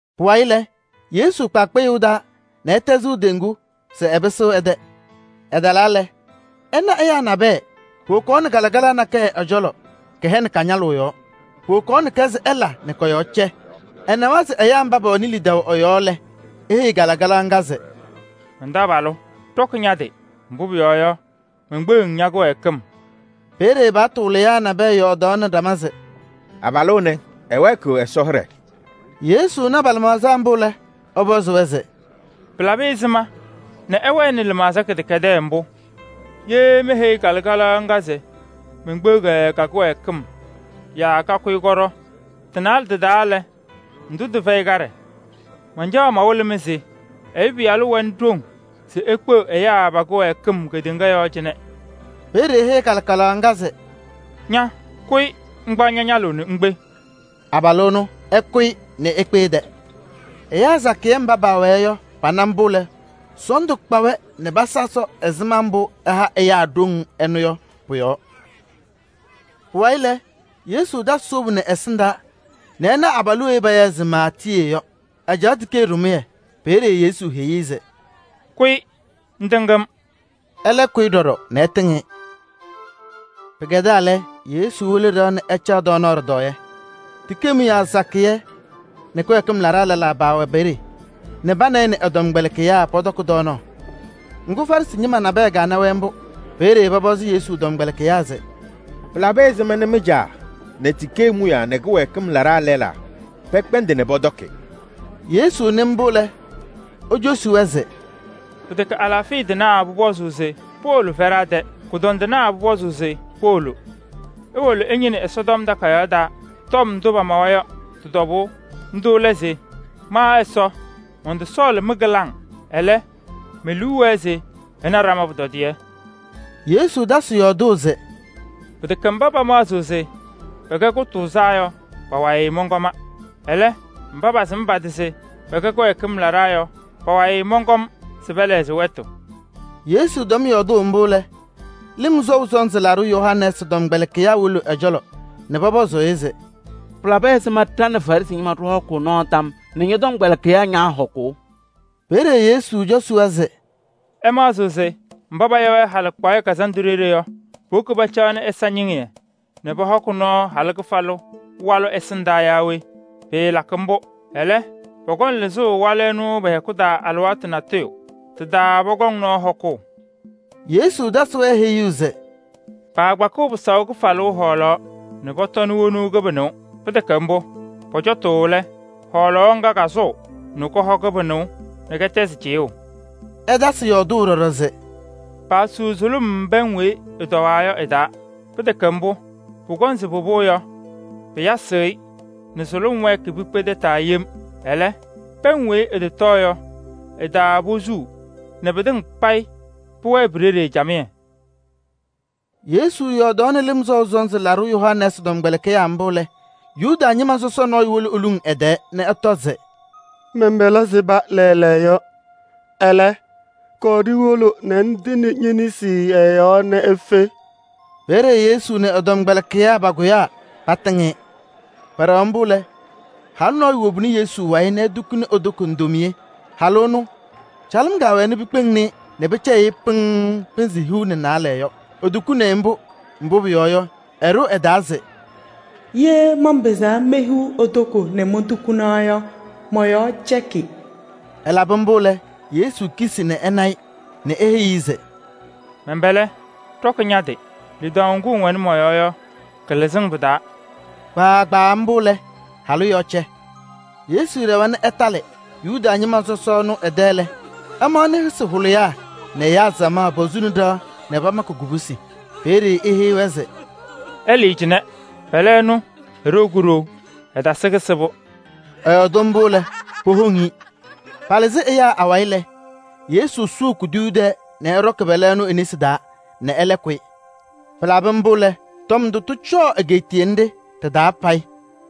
Pʋwayɩ lɛ, Yesu kpa kpɩyʋʋ taa nɛ ɛtɛzɩ teŋgu se ɛpɩsɩɣ ɛ-tɛ. Ɛtalaa lɛ, ɛnaɣ ɛyaa nabɛyɛ, powokaɣnɩ kalɩkalaɣ nakɛyɛ ɛ-cɔlɔ, kɛhɛnɩ ka-ñalʋʋ yɔɔ. Powokaɣnɩ-kɛ se ɛla nɛ kɔ-yɔɔ cɛ. Ɛnawa se ɛyaa mba pɛwɛnɩ lidaʋ ɛ-yɔɔ lɛ, eheyi kalɩkalaɣ ŋga se: “Man-taabalʋ! Ɖɔkɩ ña-tɩ, mbʋ pʋyɔɔ yɔ, menkpeɣ-ŋ ña-kɩwɛɛkɩm.” Peeye paɣtʋ wɩlɩyaa nabɛyɛ yɔɔdaɣnɩ ɖama se: “Abalʋ ɛnɛ ɛwɛɛkɩɣ Ɛsɔ hɩɖɛ!” Yesu na pa-lɩmaɣza mbʋ lɛ, ɛpɔzɩ-wɛ se: “Pɩlabɩ ɛzɩma nɛ ɩwɛnɩ lɩmaɣza kɩdɛkɛdɛɛ mbʋ? Ye meheyi kalɩkalaɣ ŋga se menkpeɣ-kɛ ka-kɩwɛɛkɩm yaa kakʋyɩ kɔɖɔ, tɩ-naalɛ tɩ-taa lɛ, ndʋ tɩfɛyɩ kaɖɛ? Mancaɣ mawɩlɩ-mɩ se Ɛyʋ Pɩyalʋ wɛnɩ ɖoŋ se ekpeɣ ɛyaa pa-kɩwɛɛkɩm kedeŋa yɔɔ cɩnɛ.” Peeye eheyi kalɩkalaɣ ŋga se: “Ña! Kʋyɩ ŋkpaɣ ña-ñalʋʋ nɛ ŋkpe.” Abalʋ ɛnʋ ɛkʋyɩ nɛ ekpe ɛ-tɛ. Ɛyaa sakɩyɛ mba paawɛɛ yɔ pana mbʋ lɛ, sɔɔndʋ kpa-wɛ nɛ pasa Ɛsɔ ɛzɩma mbʋ ɛha ɛyaa ɖoŋ ɛnʋ yɔ pʋ-yɔɔ. Pʋwayɩ lɛ, Yesu tasɩ wobu nɛ ɛsɩndaa nɛ ɛna abalʋ weyi payaɣ se Maatiyee yɔ, ɛcaɣ tikee ɖɩmʋyɛ. Peeye Yesu heyi-i se: “Kʋyɩ ŋtɩŋ-m!” Ɛlɛ kʋyɩ ɖɔɖɔ nɛ ɛtɩŋ-ɩ. Pɩkɛdaa lɛ, Yesu wolo ɖɩɣa nɛ ɛcaɣ tɔɔnaɣ ɖɩtɔɔyɛ. Tikee mʋyaa sakɩyɛ nɛ kɩwɛɛkɩm laɖaa lɛlaa paawɛ peeye nɛ pa nɛ ɩ nɛ ɛ-tɔmkpɛlɩkɩyaa pɔtɔkɩ tɔɔnaɣ. Ŋgʋ, Farɩsɩ ñɩma nabɛyɛ kana-wɛ mbʋ. Peeye pɔpɔzɩ Yesu tɔmkpɛlɩkɩyaa se: “Pɩlabɩ ɛzɩma nɛ mɩ-caa nɛ tikee mʋyaa nɛ kɩwɛɛkɩm laɖaa lɛlaa pɛkpɛndɩ nɛ pɔtɔkɩ?” Yesu nɩ mbʋ lɛ, ecosi-wɛ se: “Pɩtɛkɛ alaafɩya tɩnaa pʋpɔzʋʋ se powolo fɛɖaa tɛ, kʋdɔndɩnaa pʋpɔzʋʋ se powolo. Iwolo ɩñɩnɩ Ɛsɔtɔm Takayaɣ taa tɔm ndʋ pamawa yɔ tɩ-tɔbʋʋ. Ndʋ lɛ se: ‘Ma Ɛsɔ mɔntɔsɔɔlɩ mɩ-kɩlaŋ, ɛlɛ, me-liu wɛɛ se ɩna ɖama pʋtɔdɩyɛ.’” Yesu tasɩ yɔɔdʋʋ se: “Pɩtɛkɛ mba pamaɣzɩɣ se pɛkɛ kʋtʋʋzaa yɔ pa-wayɩ mɔnkɔma. Ɛlɛ, mba pasɩm pa-tɩ se pɛkɛ kɩwɛɛkɩm laɖaa yɔ pa-wayɩ mɔnkɔm se pɛlɛɣzɩ wɛtʋ.” Yesu tɛm yɔɔdʋʋ mbʋ lɛ, Lɩm Sɔʋ Sɔnzɩ Laɖʋ Yohanɛɛsɩ tɔmkpɛlɩkɩyaa wolo ɛ-cɔlɔ nɛ pɔpɔzʋʋ-ɩ se: “Pɩlabɩ ɛzɩma ɖa nɛ Farɩsɩ ñɩma ɖɩhɔkʋʋ nɔɔ tam nɛ ñɔ-tɔmkpɛlɩkɩyaa ñaahɔkʋʋ?” Peeye Yesu cosi-wɛ se: “Ɩmaɣzɩɣ se mba paya-wɛ halɩkpaɣyɛ kazandʋ ɖeɖe yɔ, powoki pacaɣnɩ ɛza ñɩŋɩyɛ nɛ pɔhɔkɩ nɔɔ halʋ kɩfalʋ walʋ ɛsɩndaa yaa we? Pɩɩlakɩ mbʋ! Ɛlɛ, pɔkɔŋ lɩzʋʋ walʋ ɛnʋ pɛ-hɛkʋ taa alɩwaatʋ natʋyʋ. Tɩ-taa pɔkɔŋ nɔɔ hɔkʋʋ.” Yesu tasɩ-wɛ heyuu se: “Paakpakɩɣ pɩsaʋ kɩfalʋʋ hɔɔlaɣ nɛ pɔtɔnɩ wonuu kɩbɩnʋʋ. Pɩtɛkɛ mbʋ, pɔcɔtʋʋ lɛ, hɔɔlaɣ ŋga kasʋʋ nɛ kɔhɔ kɩbɩnʋʋ nɛ kɩtɛzɩ cɩyʋʋ.” Ɛtasɩ yɔɔdʋʋ ɖɔɖɔ se: “Paasuu sʋlʋm pɛŋ weyi ɩtɔwaa yɔ ɩ-taa. Pɩtɛkɛ mbʋ, pʋkɔŋ se pɩpɩɣ yɔ, pɩyasɩɣ-ɩ nɛ sʋlʋm wɛɛkɩ pikpe tataa yem. Ɛlɛ, pɛŋ weyi ɩtɔtɔɔ yɔ, ɩ-taa posuu nɛ pɩtɩŋa payɩ pʋwɛɛ pi-ɖeɖe camɩyɛ.” Yesu yɔɔdaɣnɩ Lɩm Sɔʋ Sɔnzɩ Laɖʋ Yohanɛɛsɩ tɔmkpɛlɩkɩyaa mbʋ lɛ, Yuda ñɩma sɔsɔ nɔɔyʋ wolo eluŋ ɛ-tɛɛ nɛ ɛtɔ se: “Mɛn-pɛlɛ sɩba naɣ yɔ lɛɛlɛɛyɔ. Ɛlɛ, kɔɔ ɖiwolo nɛ ŋtɩnɩ ñe-nesi ɛ-yɔɔ nɛ efe.” Peeye Yesu nɛ ɛ-tɔmkpɛlɩkɩyaa pakʋyaa patɩŋ-ɩ. Pɛɖɛɣaɣ mbʋ lɛ, halʋ nɔɔyʋ wobini Yesu wayɩ nɛ etukuni e-toko ndomiye. Halʋ ɛnʋ, calɩm kɛwɛɛ pikpeŋni-i nɛ pɩcɛyɩɣ-ɩ pɩŋŋ pɩnzɩ hiu nɛ naalɛ yɔ. Etukuni-i mbʋ, mbʋ pʋyɔɔ yɔ, ɛɖʋ ɛ-taa se: “Ye manpɩzaa mehiɣ e-toko nɛ montukina yɔ, mɔ-yɔɔ cɛkɩ.” Ɛlabɩ mbʋ lɛ, Yesu kisi nɛ ɛ-wayɩ nɛ ɛna-ɩ nɛ eheyi-i se: “Mɛn-pɛlɛ! Ɖɔkɩ ña-tɩ! Lidaʋ ŋgʋ ŋwɛnɩ mɔ-yɔɔ yɔ, kɩlɩzɩ-ŋ pɩ-taa.” Kpaagbaa mbʋ lɛ, halʋ yɔɔ cɛ. Yesu ɖɛwa nɛ ɛtalɩ Yuda ñɩma sɔsɔ ɛnʋ ɛ-tɛ lɛ, ɛmaɣnɩ yɩsɩ hʋlɩyaa nɛ ɛyaa samaɣ posuni ɖɩɣa nɛ pamakɩ kubusi. Peeye eheyi-wɛ se: “Ɩlɩɩ cɩnɛ, pɛlɛ ɛnʋ eɖou kuɖou, ɛtasɩ kɩsɩbʋ.” Ɛyɔɔdɩ mbʋ lɛ, powoŋ-i. Palɩzɩ ɛyaa awayɩ lɛ, Yesu sʋʋ kuduyuu tɛɛ nɛ ɛɖɔkɩ pɛlɛ ɛnʋ e-nesi taa nɛ ɛlɛ kʋyɩ. Pɩlabɩ mbʋ lɛ, tɔm ndʋ tɩcɔɔ egeetiye nɖɩ ɖɩ-taa payɩ.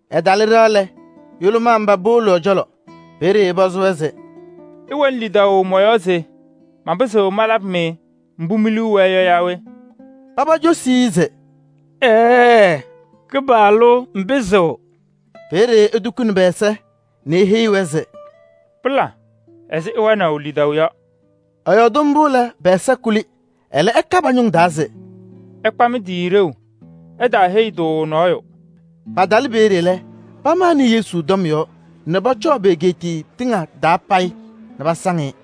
Ɛtalɩ ɖɩɣa lɛ, yʋlʋmaa mba powolo ɛ-cɔlɔ. Peeye ɛpɔzɩ-wɛ se: “Ɩwɛnɩ lidaʋ mɔ-yɔɔ se manpɩzɩɣ malabɩ-mɩ mbʋ mi-liu wɛɛ yɔ yaa we?” Paba cosi-i se: “Ɛɛɛ, Kɩpaɣlʋ ŋpɩzɩɣ.” Peeye etukuni pɛ-ɛza nɛ eheyi-wɛ se: “Pɩla ɛzɩ ɩwɛnaʋ lidaʋ yɔ.” Ɛyɔɔdɩ mbʋ lɛ, pɛ-ɛza kuli. Ɛlɛ ɛka pa-ñʋŋ taa se: “Ɩkpa mɩ-tɩ ɖeu, ɩtaaheyi-tʋ nɔɔyʋ.” Patɩlɩ peeye lɛ, pamanɩ Yesu tɔm yɔɔ nɛ pɔcɔɔ pe-egeetiye tɩŋa taa payɩ nɛ pasaŋ-ɩ.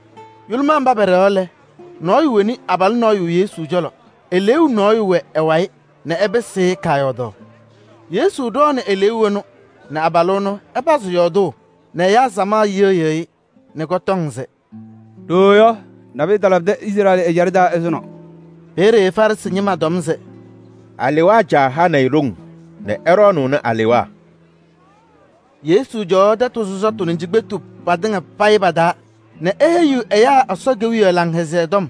Yʋlʋmaa mba pɛɖɛɣaɣ lɛ, nɔɔyʋ woni abalʋ nɔɔyʋ Yesu cɔlɔ. Eleeu nɔɔyʋ wɛ ɛ-wayɩ nɛ ɛpɩsɩ-ɩ kaayɔɔdaɣ. Yesu ɖɔɔnɩ eleeu ɛnʋ nɛ abalʋ ɛnʋ ɛpazɩ yɔɔdʋʋ nɛ ɛyaa samaɣ yɩɣyɩɣ-ɩ nɛ kɔtɔŋ se: “Ɖooo yɔ, nabʋyʋ talabɩdɩ Izrɛɛlɩ ɛjaɖɛ taa ɛzʋnɔ!” Peeye Farɩsɩ ñɩma tɔm se: “Alewaa caa hanɩ-ɩ ɖoŋ nɛ ɛɖɔɔnʋʋnɩ alewaa.” Yesu cɔwaɣ tɛtʋ sɔsɔtʋ nɛ cikpetu patɩŋa pa-taa nɛ eheyiɣ ɛyaa Ɛsɔ Kewiyaɣ Laŋhɛzɩyɛ Tɔm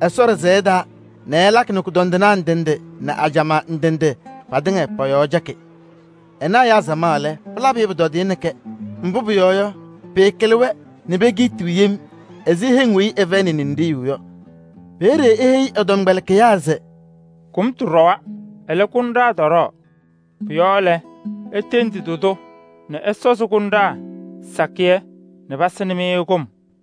Ɛsɔ ɖɩsɛyɛ taa nɛ ɛlakɩ nɛ kʋdɔndɩnaa ndɩ ndɩ nɛ ajamaa ndɩ ndɩ patɩŋa pɔ-yɔɔ cɛkɩ. Ɛna ɛyaa samaɣ lɛ, pɩlabɩ-ɩ pʋtɔdɩyɛ nɛ kɛ. Mbʋ pʋyɔɔ yɔ, pɩɩkɩlɩ-wɛ nɛ pekiitiɣ yem ɛzɩ heŋ weyi ɩfɛyɩnɩ ninɖiɣyu yɔ. Peeye eheyi ɛ-tɔmkpɛlɩkɩyaa se: “Kʋmtʋ ɖɔwa, ɛlɛ, kʋnɖaa tɔɖɔɔ. Pʋ-yɔɔ lɛ, itendi tɩ-tʋ nɛ ɛsɔzɩ kʋnɖaa sakɩyɛ nɛ pasɩnɩ-mɩ kʋm.”